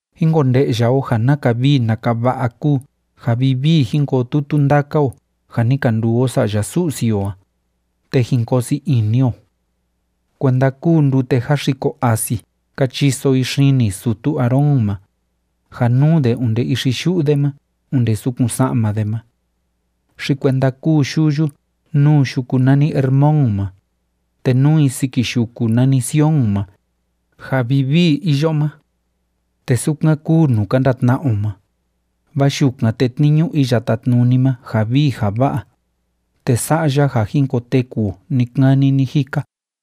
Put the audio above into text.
¡Jín konde'ya o ja naka vii naka va'a kúu ja vivii jin koo tutu ndaka o ja ni ka nduu o sa'ya Su'si o a, te jin koo sii ini o! Kuenda kúu ndute jáxiko asi ka chiso i xini sutu Aarón ma, ja núu de onde ixi yu'u de ma onde sukun sa'ma de ma. Xi kuenda kúu yuyu núu yuku nani Hermón ma, te núu i siki yuku nani Sion ma, ja vivii iyo ma. Te sukan kúu nuu ka ndatna'a o ma, vaa yukan tétniñu Iya Tátnuni ma ja vii ja va'a, te sa'a ya ja jin koteku o ni‑kani ni‑jika.